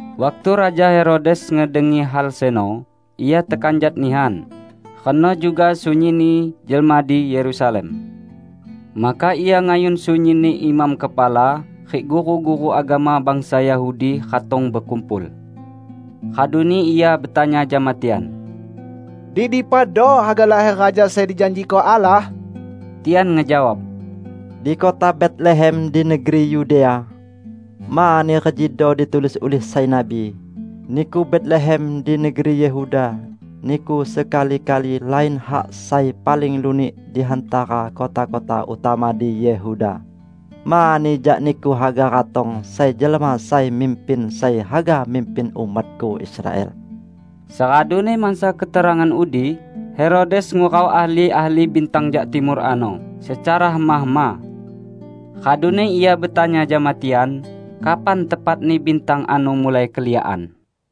Waktu Raja Herodes ngedengi hal seno, ia tekanjat nihan, reno juga sunyinni jelma di Yerusalem. Maka ia ngayun sunyinni imam kepala rik guru-guru agama bangsa Yahudi ratong bekumpul. Raduni ia betanya jama tian, "Di dipado haga laher Raja sai dijanjiko Allah?" Tian ngejawab, "Di kota Betlehem di negeri Yudea. Mani rejido ditulis ulih sai nabi, 'Niku Betlehem, di negeri Yehuda, niku sekali-kali lain hak sai paling lunik di hantara kota-kota utama di Yehuda. Mani jak niku haga ratong sai jelma sai mimpin sai haga mimpin umat-Ku Israel.' " Seraduni mansa keterangan udi, Herodes ngurau ahli-ahli bintang jak Timur ano secara hema-hema. Raduni ia betanya jama tian kapan tepatni bintang ano mulai keliakan.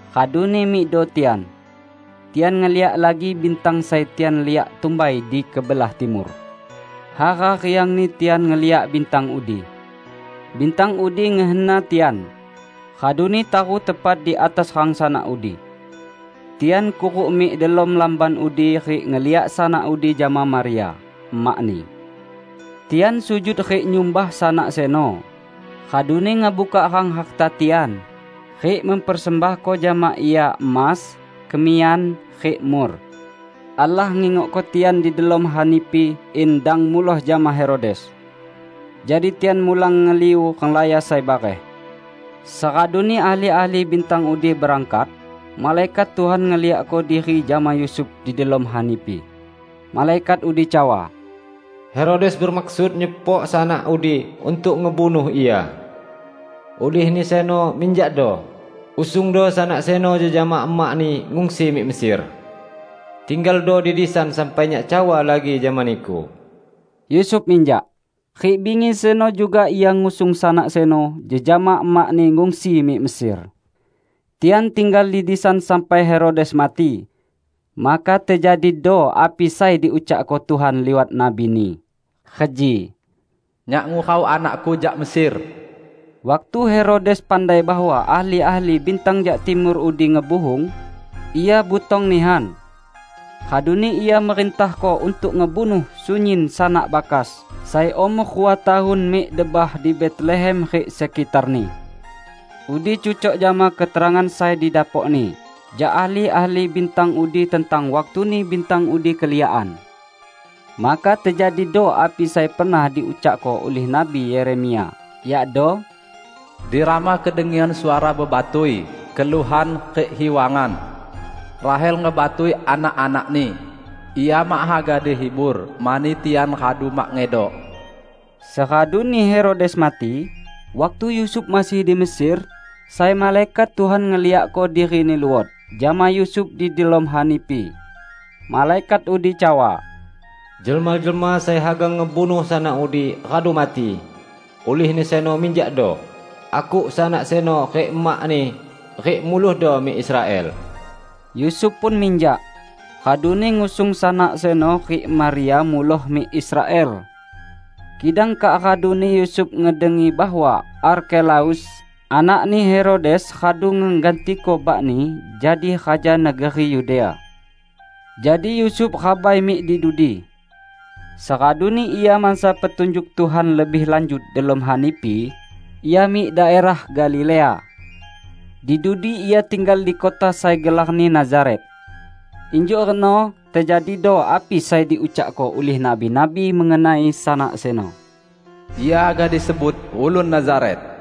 Raduni mikdo tian. Tian ngeliak lagi bintang sai tian liak tumbai di kebelah timur. Hara riangni tian ngeliak bintang udi! Bintang udi ngehena tian, raduni taru tepat di atas rang Sanak udi. Tian kuruk mik delom lamban udi rik ngeliak Sanak udi jama Maria, emak-Ni. Tian sujud rik nyumbah Sanak seno, raduni ngebukak rang harta tian, rik mempersembahko jama Ia emas, kemiyan, rik mur. Allah ngingokko tian di delom hanipi in dang muloh jama Herodes. Jadi tian mulang ngeliu renglaya sai bareh. Seraduni ahli-ahli bintang udi berangkat, malaikat Tuhan ngeliakko diri jama Yusuf di delom hanipi. Malaikat udi cawa, "Herodes bemaksud nyepok Sanak udi untuk ngebunuh Ia. Ulihni seno minjakdo, usungdo Sanak seno jejama emak-Ni ngungsi mik Mesir. Tinggaldo di disan sampai Nyak cawa lagi jama niku." Yusuf minjak, rik bingi seno juga ia ngusung Sanak seno jejama emak-Ni ngungsi mik Mesir. Tian tinggal di disan sampai Herodes mati. Maka tejadido api sai diucakko Tuhan liwat nabi-Ni, reji, "Nyak ngurau Anak-Ku jak Mesir." Waktu Herodes pandai bahwa ahli-ahli bintang jak Timur udi ngebuhung, ia butong nihan. Raduni ia merintahko untuk ngebunuh sunyin sanak bakas sai umor rua tahun mik debah di Betlehem rik sekitarni. Udi cucok jama keterangan sai didapokni jak ahli-ahli bintang udi tentang waktuni bintang udi keliakan. Maka tejadido api sai pernah diucakko ulih Nabi Yeremia, yakdo, "Di Rama kedengian suara bebatui, keluhan rik hiwangan. Rahel ngebatui anak-anakni; ia mak haga dihibur mani tian radu mak ngedok." Seraduni Herodes mati, waktu Yusuf masih di Mesir sai malaikat Tuhan ngeliakko dirini luot jama Yusuf di delom hanipi. Malaikat udi cawa, "Jelma-jelma sai haga ngebunuh Sanak udi radu mati. Ulihni seno minjakdo, akuk Sanak seno rik emak-Ni rik mulohdo mik Israel." Yusuf pun minjak, raduni ngusung Sanak seno rik Maria muloh mik Israel. Kidang kak raduni Yusuf ngedengi bahwa Arkelaus, anakni Herodes radu ngegantiko bakni jadi raja negeri Yudea. Jadi Yusuf rabai mik di dudi. Seraduni ia mansa petunjuk Tuhan lebih lanjut delom hanipi, ia mik daerah Galilea. Di dudi ia tinggal di kota sai gelarni Nazaret. Injuk reno tejadido api sai diucakko ulih nabi-nabi mengenai Sanak seno: "Ia haga disebut Ulun Nazaret."